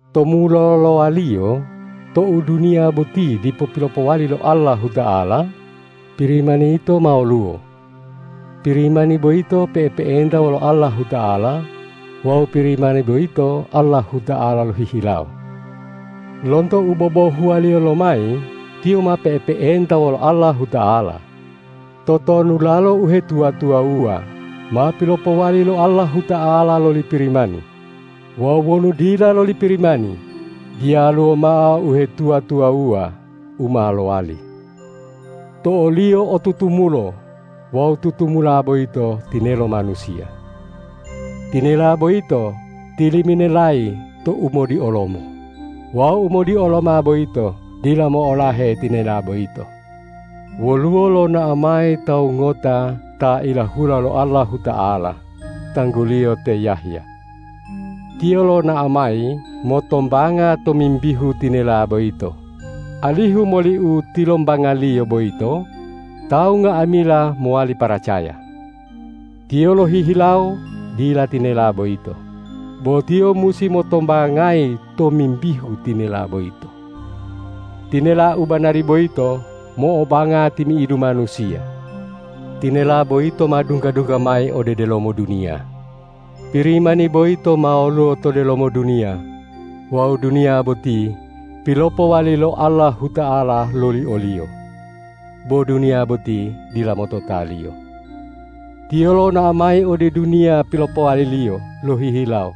To mulolowaliyo tou duniya boti dipo pilopowali lo Allahuta'ala, Pirimani yito ma woluwo; Pirimani boyito pe'epe'enta wolo Allahuta'ala, wawu Pirimani boyito Allahuta'ala lohihilawo. Lonto u bobohuwaliyo lomayi Tiyo ma pe'epe'enta wolo Allahuta'ala. Totonulalo uhetuwa-tuwawuwa ma pilopowali lo Allahuta'ala loli Pirimani; wawu wonu dila loli Pirimani, diyaluwo mao uhetuwa-tuwawuwa u ma lowali. To o-Liyo o tutumulo wawu tutumula boyito tinelo manusiya. Tinela boyito tiliminelayi to umodiolomo, wawu umodioloma boyito dila mo'olahe tinela boyito. Woluwo lonao mayi tawu ngota ta ilahula lo Allahuta'ala, tangguliyo te Yahya. Tiyo lonao mayi motombanga tomimbihu tinela boyito, alihu moli u tilombangaliyo boyito tawu nga'amila mowali paracaya. Tiyo lohihilawo dila tinela boyito, bo tiyo musi motombangayi tomimbihu tinela boyito. Tinela u banari boyito mo'obanga timi'idu manusiya. Tinela boyito ma dungga-dungga mayi ode delomo duniya. Pirimani boyito ma woluwo to delomo duniya wawu duniya boti pilopowali lo Allahuta'ala loli o-Liyo, bo duniya boti dila motota-Liyo. Tiyo lonao mayi ode duniya pilopowali-Liyo lohihilawo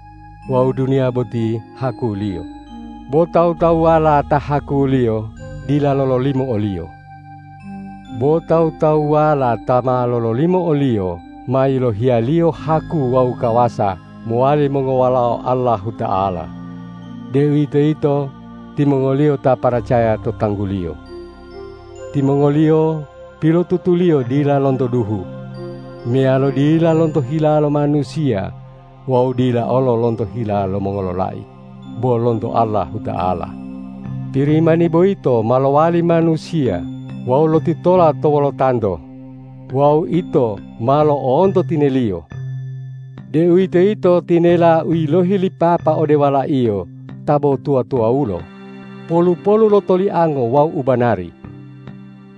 wawu duniya boti haku-Liyo, bo tawu-tawuwala ta haku-Liyo dila lololimo o-Liyo. Bo tawu-tawuwala ta ma lololimo o-Liyo ma yilohiya-Liyo haku wawu kawasa mowali mongowalao Allahuta'ala, deuwitoyito timongoliyo ta paracaya to tanggu-Liyo. Timongoliyo pilotutuliyo dila lonto duhu, meyalo dila lonto hila lo manusiya wawu dila olo lonto hila lo mongololai, bo lonto Allahuta'ala. Pirimani boyito ma lowali manusiya wawu lotitola to wolotanto; wawu ito ma lo'onto tine-Liyo, deuwitoyito tinela u yilohi li Papa ode Wala-Iyo ta bo tuwa-tuwawulo, polu-polu lo toliango wawu ubanari.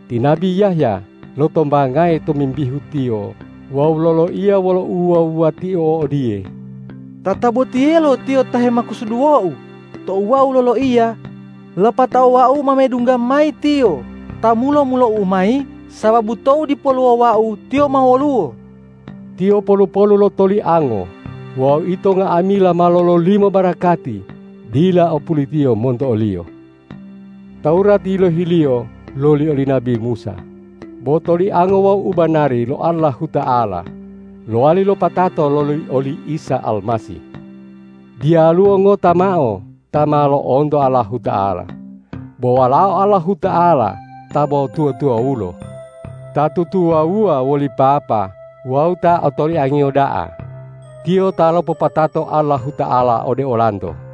Ti nabi Yahya lotombangayi tomimbihu Tiyo wawu loloiya wolo uwuwa-wuwatio odiye,”Tatabotiyelo Tiyo ta hemakusuduwou tou wau loloiya: Lapatao wau ma medungga mayi Tiyo ta mulo-mulou mayi sababu tou dipoluwo wau, Tiyo ma woluwo.” Tiyo polu-polu lo toliango wawu ito nga'amila ma lololimo barakati dila o pulitiyo monto o-Liyo. Tawurat yilohiliyo loli oli nabi Musa, bo toliango wawu ubanari lo Allahuta'ala lowali lopatato loli oli Isa Almasih. Diyaluwo ngota mao ta ma lo'onto Allahuta'ala, bo Walao Allahuta'ala ta bo tuwa-tuwawulo, ta tutuwawuwa woli Papa wawu ta otoliang-Iyo da'a, Tiyo ta lopopatato Allahuta'ala ode olanto.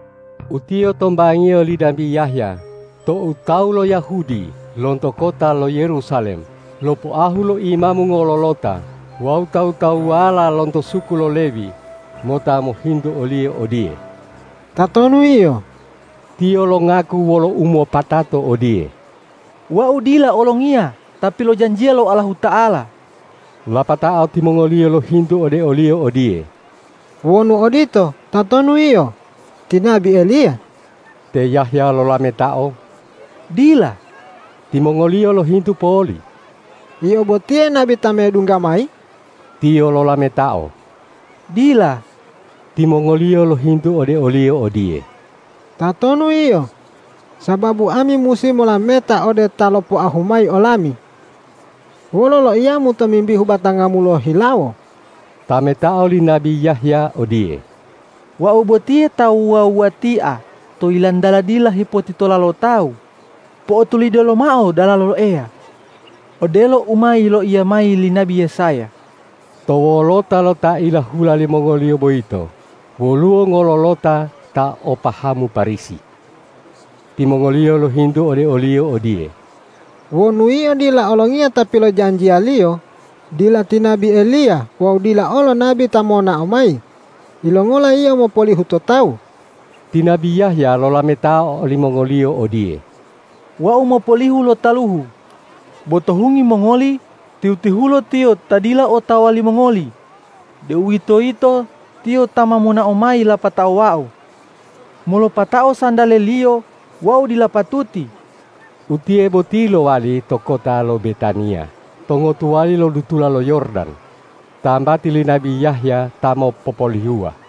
Utiye tombangiyo li nabi Yahya tou tawu lo Yahudi lonto kota lo Yerusalem lopoahu lo imamu ngololota wawu tawu-tawuwala lonto suku lo Lewi mota mohintu oliyo odiye,”Tatonu yio?” Tiyo longaku wolo umopatato odiye,”Wau dila Olongiya ta pilojanjiya lo Allahuta'ala.” Lapatao timongoliyo lohintu ode oliyo odiye,”Wonu odito, tatonu yio? Ti nabi Eliya?” Te Yahya lolametao,”Dila.” Timongoliyo lohintu poli,”Yio botiye nabi ta medungga mayi?” Tiyo lolametao,”Dila!” Timongoliyo lohintu ode oliyo odiye,”Tatonu yio? Sababu ami musi molameta ode ta lopoahu mayi olami. Wolo loiyamu tomimbihu batangamu lohihilawo?” Tametao li nabi Yahya odiye,”Wau botiye ta wuwa-wuwatia to yilantala dila hepotitola lo tawu: Po'otulide lomao dalalo Eya! odelo u ma yiloiya mayi li nabi Yesaya.” To wolota lo ta ilahula limongoliyo boyito woluwo ngololota ta o pahamu Parisi. Timongoliyo lohintu ode oliyo odiye,”Wonu yio dila Olongiya ta pilojanjiyaliyo, dila ti nabi Eliya wawu dila olo nabi ta monao mayi, yilongola yio mopolihu to tawu?” Ti nabi Yahya lolametao olimongoliyo odiye,”Wau mopolihu lo taluhu. Bo to hungi mongoli, tihu-tihulo Tiyo ta dila otawa limongoli, deuwitoyito Tiyo ta ma monao mayi lapatao wau. Molopatao santale-Liyo wau dila patu- ti.” Utiye boti lowali to kota lo Betaniya to ngotuwali lo dutula lo Yordan, tambati li nabi Yahya ta mopopolihuwa.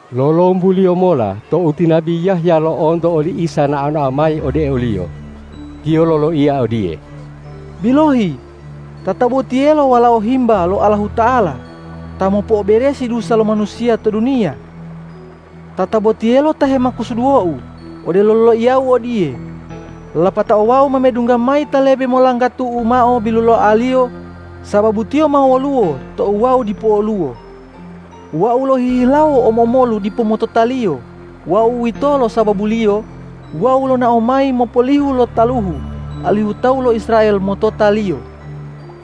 Lolombuliyo mola tou ti nabi Yahya lo'onto oli Isa nao-nao mayi ode oliyo, tiyo loloiya odiye,”Bilohi, tatabotiyelo Walao Himba lo Allahuta'ala, ta mopo'oberesi dusa lo manusiya to duniya. Tatabotiyelo ta hemakusuduwou odelo loiyau odiye, ’Lapatao wau ma medungga mayi Ta lebe molanggatu'u mao biluloaliyo, sababu Tiyo ma woluwo tou wau dipoluwo.’ Wau lohihilawo omo-omolu dipo motota-Liyo wawu uwitolo sababuliyo wau lonao mayi mopolihu lo taluhu, alihu tawu lo Israel motota-Liyo.”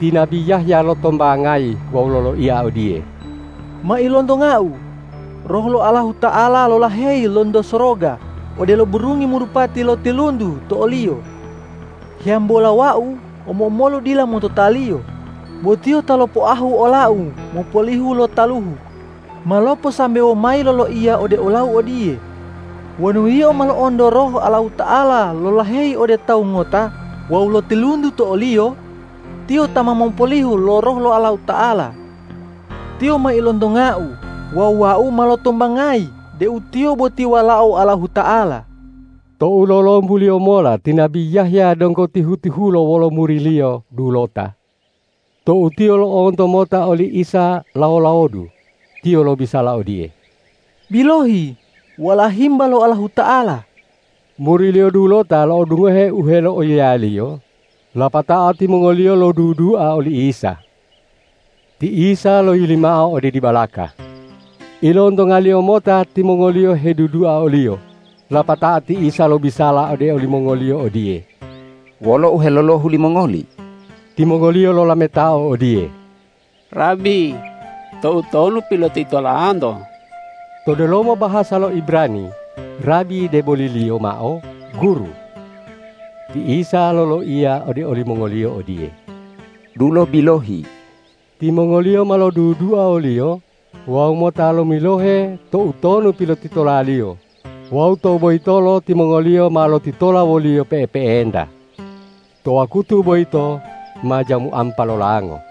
Ti nabi Yahya lotombangayi wawu loloiya odiye,”Ma ilontongau Roh lo Allahuta'ala lolaheyi lonto soroga odelo burungi marupati lotiluntu to o-Liyo. Hiyambola wau omo-omolu dila motota-Liyo, bo Tiyo ta lopoahu olau mopolihu lo taluhu, ma loposambewo mayi loloiya ode olau odiye, ’Wonu yio ma lo'onto Roh Allahuta'ala lolaheyi ode Tawu ngota wawu lotiluntu to o-Liyo, Tiyo ta ma mopolihu lo Roh lo Allahuta'ala.’ Tiyo ma ilontongau wawu wau ma lotombangayi deu Tiyo boti Walao Allahuta'ala.” Tou lolombuliyo mola ti nabi Yahya donggo tihu-tihulo wolo muriliyo dulota. Tou tiyo lo'onto mota oli Isa lawo-lawodu, tiyo lobisala odiye,”Bilohi, Walao Himba lo Allahuta'ala!” Muriliyo dulota lo'odungohe u heloiyaliyo, lapatao timongoliyo lodudua oli Isa. Ti Isa loyili mao ode dibalaka. Ilontonga-Liyo mota timongoliyo hedudua o-Liyo, lapatao ti Isa lobisala ode olimongoliyo odiye,”Wolo u helolohu limongoli?” Timongoliyo lolametao odiye,”Rabi, toutonu pilotitolanto?” To delomo bahasa lo Ibrani rabi deboliliyo mao guru. Ti Isa loloiya ode olimongoliyo odiye,”Dulo bilohi.” Timongoliyo ma lodudua o-Liyo wawu mota lomilohe toutonu pilotitola-Liyo wawu tou boyitolo timongoliyo ma lotitola wo-Liyo pe'epe'enta. To wakutu boyito ma jamu ampa lolango.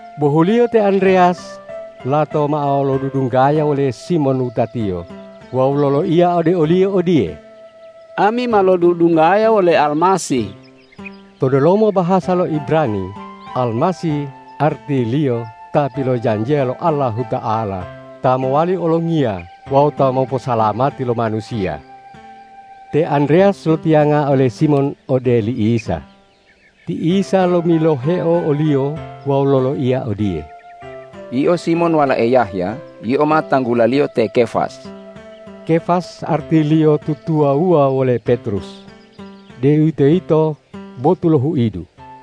Bohuliyo te Andreyas lato mao lodudunggaya wole Simon wutatiyo wawu loloiya ode oliyo odiye,”Ami ma lodudunggaya wole Almasih.” To delomo bahasa lo Ibrani Almasih artiliyo Ta pilojanjiya lo Allahuta'ala ta mowali Olongiya wawu ta moposalamati lo manusiya. Te Andreyas lotiyanga ole Simon ode li Isa. Ti Isa lomiloheo oliyo wawu loloiya odiye,”Yio Simon walae Yahya, yio ma tanggulaliyo te Kefas.” Kefas artiliyo tutuwawuwa wole Petrus, deuwitoyito botu lo huidu.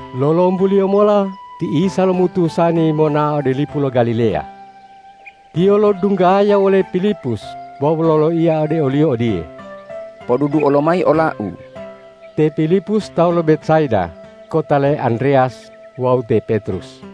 Lolombuliyo mola ti Isa lomutusani monao ode lipu lo Galileya. Tiyo lodunggaya wole Pilipus wawu loloiya ode oliyo odiye,”Poduduo lomayi ola-U!” Te Pilipus tawu lo Betsaida kota le Andreyas wawu te Petrus.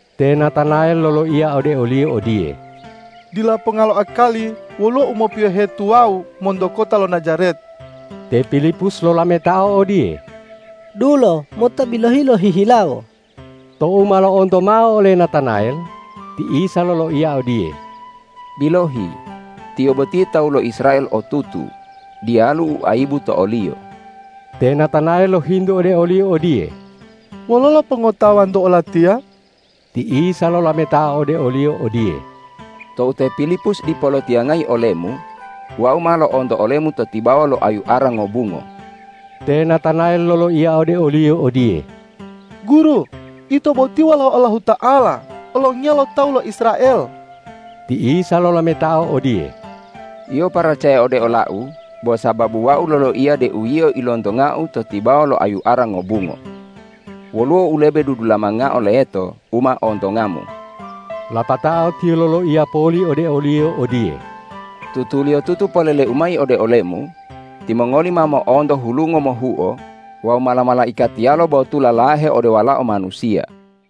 Te Natanayel loloiya ode oliyo odiye,”Dila ponga lo akali woluwo u mopiyohe tuwawu monto kota lo Najaret.” Te Pilipus lolametao odiye,”Dulo mota bilohi lohihilawo.” Tou ma lo'onto mao ole Natanayel, ti Isa loloiya odiye,”Bilohi, tiyo boti tawu lo Israel otutu, diyalu u ayibu to oliyo.” Te Natanayel lohintu ode o-Liyo odiye,”Wololo pongotawa-Nto olatiya?” Ti Isa lolametao ode oliyo odiye,”Tou te Pilipus dipo lotiyangayi olemu, Wau ma lo'onto olemu to tibawa lo ayu ara ngobungo.” Te Natanayel loloiya ode oliyo odiye,”Guru, Ito boti Walao Allahuta'ala, Olongiya lo tawu lo Israel.” Ti Isa lolametao odiye,”Yio paracaya ode ola-U bo sababu Wau loloiya deu yio ilontonga-U to tibawa lo ayu ara ngobungo. Woluwo u lebe dudulamangao leto u ma ontongamu.” Lapatao Tiyo loloiya poli ode oliyo odiye,”Tutuliyotutu polele-U mayi ode olemu: Timongoli ma mo'onto hulungo mohuo wawu mala-malaikatiyalo botula lahe ode Walao Manusiya.”